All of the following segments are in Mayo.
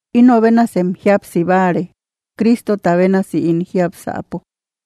Inobenasem jíapsibare, Crístota bénasi ín jiápsäpo.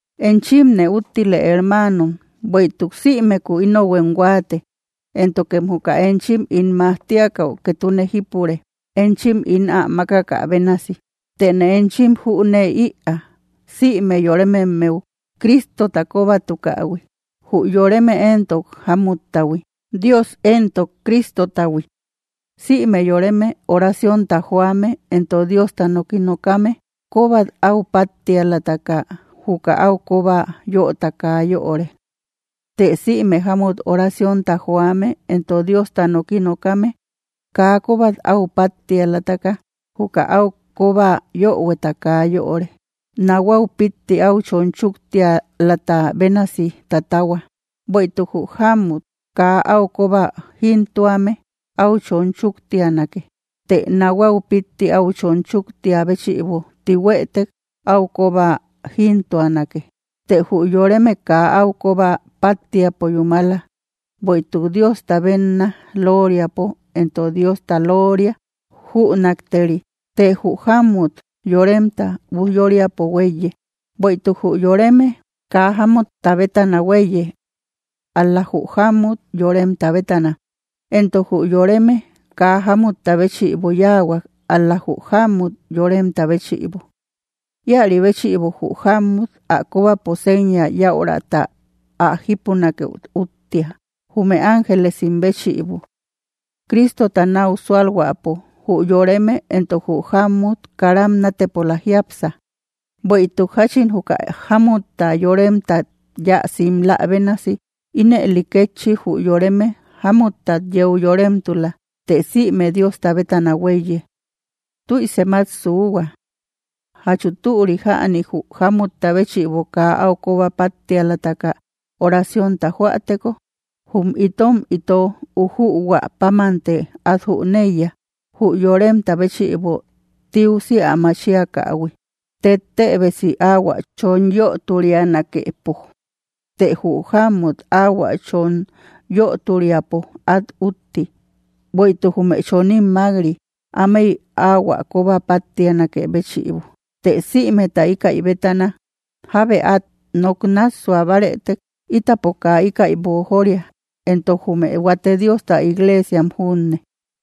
Enchimne úttile, hermanom, bueïtuk sïmeku ínohuem huaate, éntokem juka enchim ín majtiakäu ketune jípure, enchim ín ám makakä bénasi. Tëne enchin jünee‑ïa, sïme yorememmeu Cristota kobatukähui, jü yoreme entok jámuttahui, Dios entok Cristotahui. Sïme yoreme orancionta joame entok Diosta noki nokame, kobat au pattialataka, juka au koba yöta kaa yöre. Të sïme jamut oraciónta joame entok Diosta noki nokame, kaa kobat áu pattialataka, juka au koba yohueta kaa yöre; nahuau pitti au chon chuktialata bénasi tatahua. Bueïtuk jü jamut kaa áu koba jintuame, au chon chuktianake; të nahuau pitti áu chon chuktia béchïbo tihuëtek, áu koba jintuanake. Të jü yoreme kaa áu koba pattiapo yúmala, bueïtuk Diosta benna loriapo entok Diosta looria jünakteri; të jü jamut yoremta ujyóriapo huéiye. Bueïtuk jü yoreme kaa jámutta bétana huéiye, ál‑la jü jamut yoremta bétana, entok jü yoreme kaa jámutta béchïbo yáahuak, ál‑la jü jamut yoremtá béchïbo. Ïaribéchïbo jü jammut ä kobapo seña yaurata ä jípunakëu úttia, jume ángelesim béchïbo. Cristota nau sualhuäpo, jü yoreme entok jü jammut karam natepola jiápsa. Bueïtuk jachin juka jámutta yoremtat yáa simlä bénasi, ínëli kétchi jü yoreme jámuttat yeu yoremtula; të sïme Diosta bétana huéiye. Tüisem at suuhua: ¿Jachu türi jäni, jü jámutta béchïbo kaa au koba pattialataka oraciónta joäteko? Jum itom ito ujuhuä pámante at jüneiya, jü yoremta béchïbo tiusi ä machiakähui tettébesi au ä chon yöturianakëpo. Të jü jamut au ä chon yöturiapo, at utti, bueïtuk jume choním mak‑ri, ámey ahuä koba pattianakë béchïbo. Të sïmeta ikaï bétana, jábe at nok nassua bárëtek, itapo kaa íkäi boojoria, entok jume huate Diosta iglesiam junne.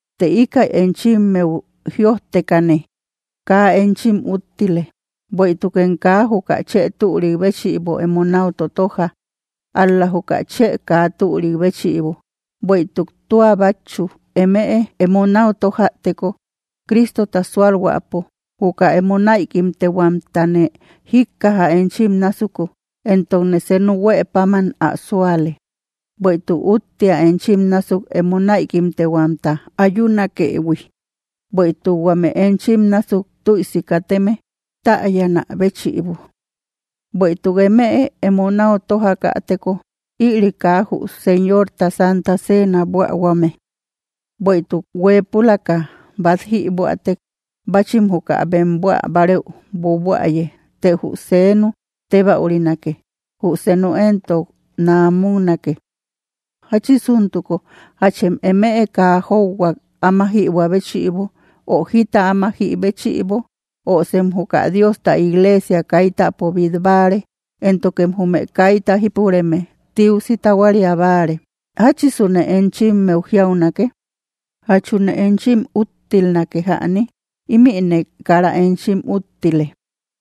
Të ikaï enchimmeu jïojtekane, kaa enchim úttile, bueïtukem kaa juka chë türik béchïbo emo nau totoja, ál‑la juka chë kaa türik béchïbo. Bueïtuk tua batchu, emëe emo nau tojäteko Cristota sualhuäpo, juka emo naïkimtehuamtane jikkaja enchim násuku, entokne senu huëpáman ä suale. Bueïtuk úttia enchim násuk emo naïkimtehuamta ayunakëhui, bueïtuk huame enchim násuk tüisi kateme täyanä béchïbo. Bueïtuk emëe emo nau tojakäteko, ïri kaa jü Señorta Santa Ceena buähuame. Bueïtuk huepülaka bat jibuätek, bachim juka bem buäbareú buabuäye, të jü senu tebaürinake, jü senu entok naamuknake. Jachisuntuko, ¿jachem emëe kaa jóuhuak áma jibua béchïbo ö jita áma jïbéchïbo? ¿Ö sem juka Diosta iglesia kaitäpo bit báare, éntokem jume kayta jipureme tiusi tahuaria báare? ¿Jachisune enchimmeu jiaunake? ¿Jachune enchim úttilnake jäni? Imïne kara enchim úttile.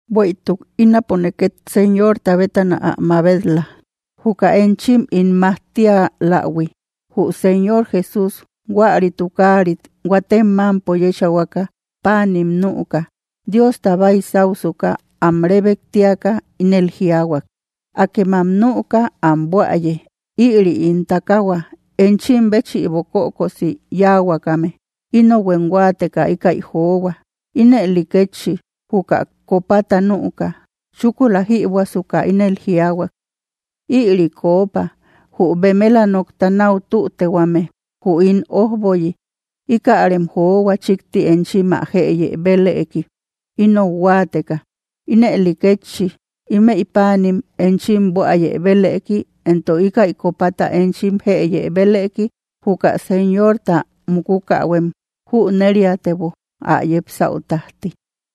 Bueïtuk ínapone ket Señorta bétana ä mabet‑la, juka enchim ín majtialähui: Jü Señor Jesús huäri tukarit huatem mampo yechahuaka, panim nüka, Diosta baisáusuka, am rebektiaka ínel jiaahuak: “Akemam nüka, ám buäye, ïri ín takahua enchim béchïbo kökosi yahuakame, inohuem huateka ikaï johua.” Ínëli kétchi juka copata nüka, chúkula jïbuäsuka, ínel jiaahuak: “Ïri kopa, jü bemela nokta nau tütehuame jü ín ojboyi, ikärem johua chikti enchim ä jëye belëki, inou huateka.” Ínëli kétchi, imey panim enchim buäye belëki, entok ikaï copata enchim jëye belëki. Juka Señorta mukukähuem jüneriaatebo, ä yepsäu tajti.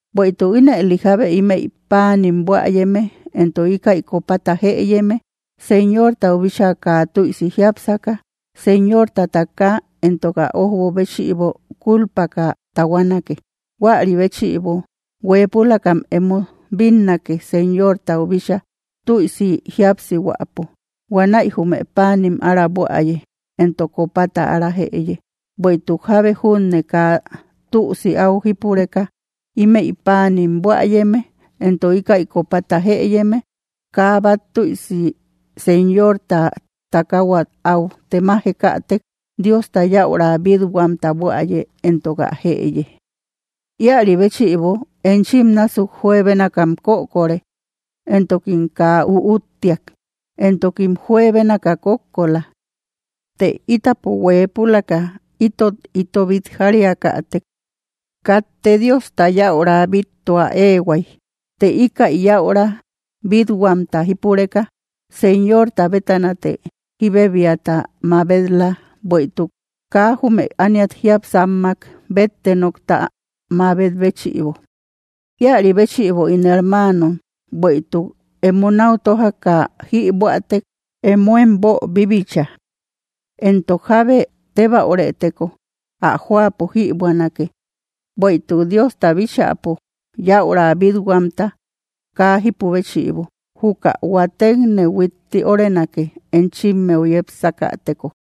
Bueïtuk ínëli jábe ímeï paanim buäyeme entok íkäi copata jëyeme, Señortau bíchaa kaa tüisi jiápsaka, Señorta takaa entok ä ojbo béchïbo kulpaka tahuanake. Huäri béchïbo, hueepulakam emo bínnake Señortau bíchaa tüisi jíapsihuäpo, huanäi jume panim ára buäye entok copata ára jëye. Bueïtuk jábe junne kaa tüsi áu jípureka, ímeï paanim buäyeme entok íkäi copata jëyeme, kaa bat tüisi Señorta takauat au temajekatek, Diosta yäura bitthuamta buäye entok ä jëye. Ïari béchïbo enchim násuk juebénakam kökore, entokim kaa üúttiak, entokim juebénaka kókko la. Të ítapo hueepulaka ítot íto bitjariakatek, katte Diosta yäura bittua eehuay. Të ikaï yäura bit huamta jípureka, Señorta bétanate jibebiata mabet‑la, bueïtuk kaa jume ániat jiápsammak bétte nokta mabet béchïbo. Ïari béchïbo ín hermanom, bueïtuk emo nau tojaka jïbuätek, emoem boobibicha. Entok jábe tebaürëteko, ä joapo jïbuänake, bueïtuk Diosta bíchäpo yäura bithuamta kaa jipü béchïbo, juka huatekne huitti órenake enchimmeu yepsakäteko.